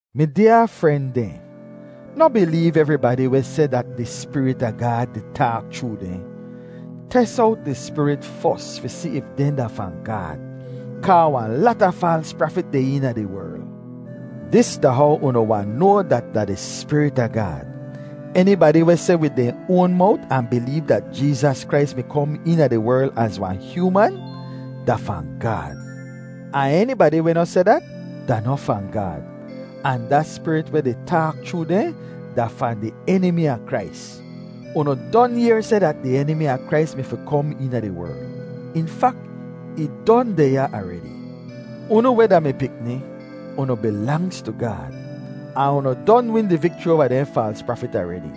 Mi dyaa fren dehn, noh bileev evribadi weh seh dat da di Spirit a Gaad di taak chroo dehn. Tes owt di spirit fos fi si if dehn da fahn Gaad, kaa wahn lata faals prafit deh eena di werl. Dis da how unu wahn noa dat da di Spirit a Gaad: enibadi weh seh wid dehn oan mowt ahn bileev dat Jeezas Krais mi kom eena di werl az wahn hyooman da fahn Gaad. Ahn enibadi weh noh seh dat da noh fahn Gaad, ahn da spirit weh di taak chroo dehn da fahn di Enimi a Krais. Unu don yehr seh dat di Enimi a Krais mi fi kom eena di werl; in fak, ih don deh ya aredi. Unu weh da mi pikni, unu bilangz tu Gaad, ahn unu don win di vikchri oava dehn faals prafit aredi;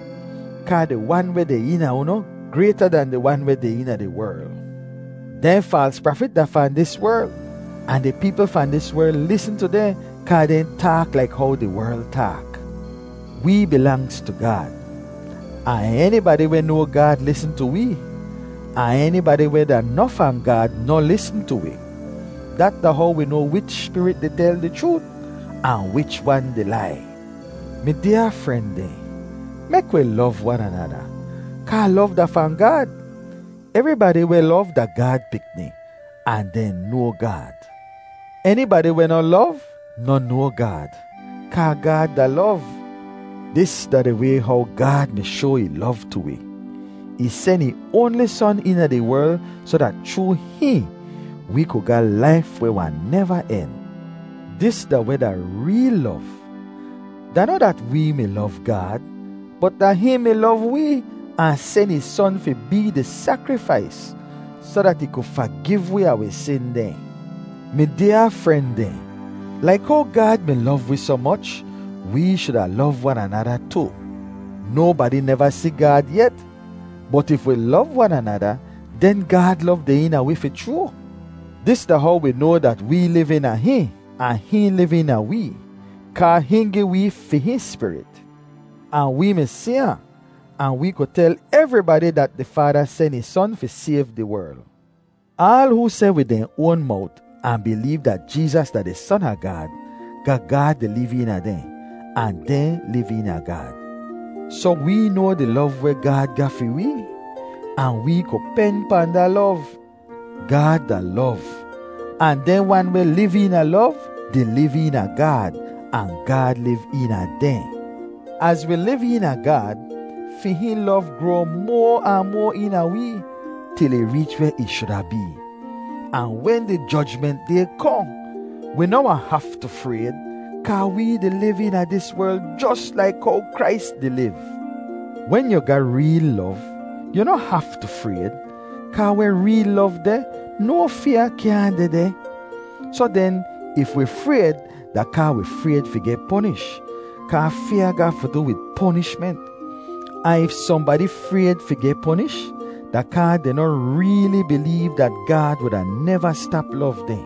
kaa di Wan weh deh eena unu grayta dan di wan weh deh eena di werl. Dehn faals prafit da fahn dis werl, ahn di peepl fahn dis werl lisn tu dehn kaa dehn taak laik how di werl taak. Wee bilangz tu Gaad, ahn enibadi weh noa Gaad lisn tu wee, ahn enibadi weh da noh fahn Gaad noh lisn tu wi. Dat da how wi noa wich spirit di tel di chroot, ahn wich wan di lai. Mi dyaa fren dehn, mek wi lov wan anada, kaa lov da fahn Gaad; evribadi weh lov da Gaad pikni, ahn dehn noa Gaad. Enibadi weh noh lov noh noa Gaad, kaa Gaad da lov. Dis da di way how Gaad mi shoa ih lov tu wi: ih sen ih oanli Son eena di werl soh dat chroo hihn, wee ku ga laif weh wahn neva en. Dis da weh da reel lov; da noh dat wee mi lov Gaad, bot da hihn mi lov wee ahn sen ih Son fi bee di sakrifais, soh dat ih ku fagiv wi a wi sin dehn. Mi dyaa fren dehn, laik how Gaad mi lov wi soh moch, wee shuda lov wan anada tu. Nobadi neva si Gaad yet, bot if wi lov wan anada, den Gaad lov deh eena wi fi chroo. Dis da how wi noa dat wee liv eena hihn ahn hihn liv eena wee, kaa hihn gi wee fi hihn Spirit. Ahn wee mi si ahn, ahn wee ku tel evribadi dat di Faada sen ih Son fi sayv di werl. Aal hoo seh wid dehn oan mowt ahn bileev dat Jeezas da di Son a Gaad, ga Gaad di liv eena dehn ahn dehn liv eena Gaad. Soh wee noa di lov weh Gaad ga fi wee, ahn wee ku pen pahn da lov. Gaad da lov, ahn dehn wan weh liv eena lov di liv eena Gaad, ahn Gaad liv eena dehn. Az wi liv eena Gaad, fi hihn lov groa moa ahn moa eena wee til ih reech weh ih shuda bee; ahn wen di Jojment Day kohn, wi noh wahn haftu frayd, kaa wee di liv eena dis werl jos laik how Krais di liv. Wen yu ga reel lov, yu noh haftu frayd, kaa weh reel lov deh, no fyaa kyaahn dehdeh. Soh den, if wi frayd, da kaa wi frayd fi geh ponish, kaa fyaa ga fi du wid ponishment. Ahn if sohnbadi frayd fi geh ponish, da kaa dehn noh reeli bileev dat Gaad wuda neva stap lov dehn.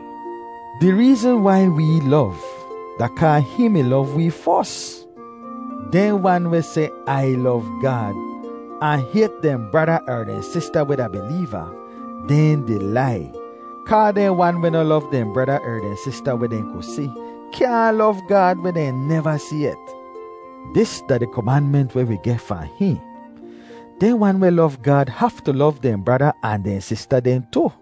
Di reezn wai wee lov, da kaa hihn mi lov wee fos. Dehn wan weh seh, “Ai lov Gaad,” ahn hayt dehn brada er dehn sista weh da bileeva, dehn di lai; kaa dehn wan weh noh lov dehn brada er dehn sista weh dehn ku si, kyaahn lov Gaad weh dehn neva si yet. Dis da di komanment weh wi geh fahn hihn: Dehn wan weh lov Gaad haftu lov dehn brada ahn dehn sista dehn tu.